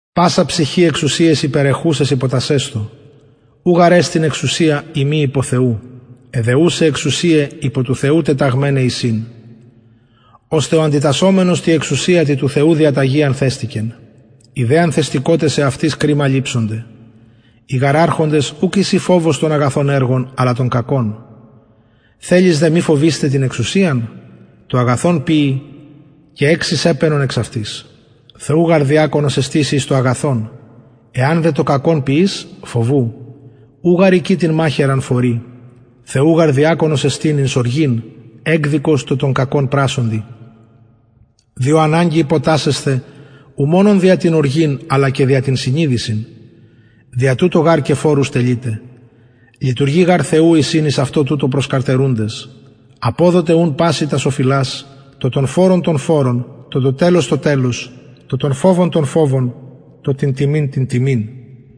πασα ψυχη εξουσιαις υπερεχουσαις υποτασσεσθω ου γαρ εστιν εξουσια ει μη υπο θεου αι δε ουσαι εξουσιαι υπο του θεου τεταγμεναι εισιν ωστε ο αντιτασσομενος τη εξουσια τη του θεου διαταγη ανθεστηκεν οι δε ανθεστηκοτες εαυτοις κριμα ληψονται οι γαρ αρχοντες ουκ εισιν φοβος των αγαθων εργων αλλα των κακων θελεις δε μη φοβεισθαι την εξουσιαν το αγαθον ποιει και εξεις επαινον εξ αυτης θεου γαρ διακονος εστιν σοι εις το αγαθον εαν δε το κακον ποιης φοβου ου γαρ εικη την μαχαιραν φορει θεου γαρ διακονος εστιν εκδικος εις οργην τω το κακον πρασσοντι διο αναγκη υποτασσεσθαι ου μονον δια την οργην αλλα και δια την συνειδησιν δια τουτο γαρ και φορους τελειτε λειτουργοι γαρ θεου εισιν εις αυτο τουτο προσκαρτερουντες αποδοτε ουν πασιν τας οφειλας τω τον φορον τον φορον τω το τελος το τελος τω τον φοβον τον φοβον τω την τιμην την τιμην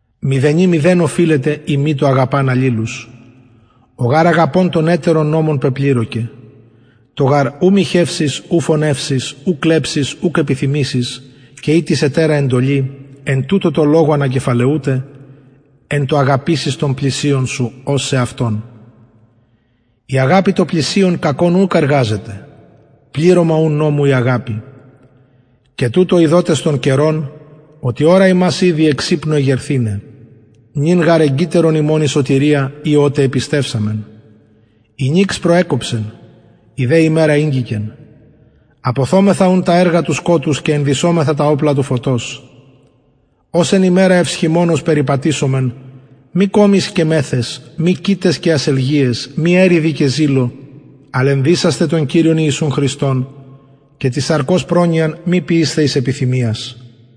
μηδενι μηδεν οφειλετε ει μη το αγαπαν αλληλους ο γαρ αγαπων τον ετερον νομον πεπληρωκεν το γαρ ου μοιχευσεις ου φονευσεις ου κλεψεις ουκ επιθυμησεις και ει τις ετερα εντολη εν τουτω τω λογω ανακεφαλαιουται εν τω αγαπησεις τον πλησιον σου ως σεαυτον η αγαπη τω πλησιον κακον ουκ εργαζεται πληρωμα ουν νομου η αγαπη και τουτο ειδοτες τον καιρον οτι ωρα ημας ηδη εξ υπνου εγερθηναι νυν γαρ εγγυτερον ημων η σωτηρια η οτε επιστευσαμεν η νυξ προεκοψεν η δε ημερα ηγγικεν αποθωμεθα ουν τα εργα του σκοτους και ενδυσωμεθα τα οπλα του φωτος ως εν ημερα ευσχημονως περιπατησωμεν μη κωμοις και μεθαις μη κοιταις και ασελγειαις μη εριδι και ζηλω αλλ ενδυσασθε τον κυριον ιησουν χριστον και της σαρκος προνοιαν μη ποιεισθε εις επιθυμιας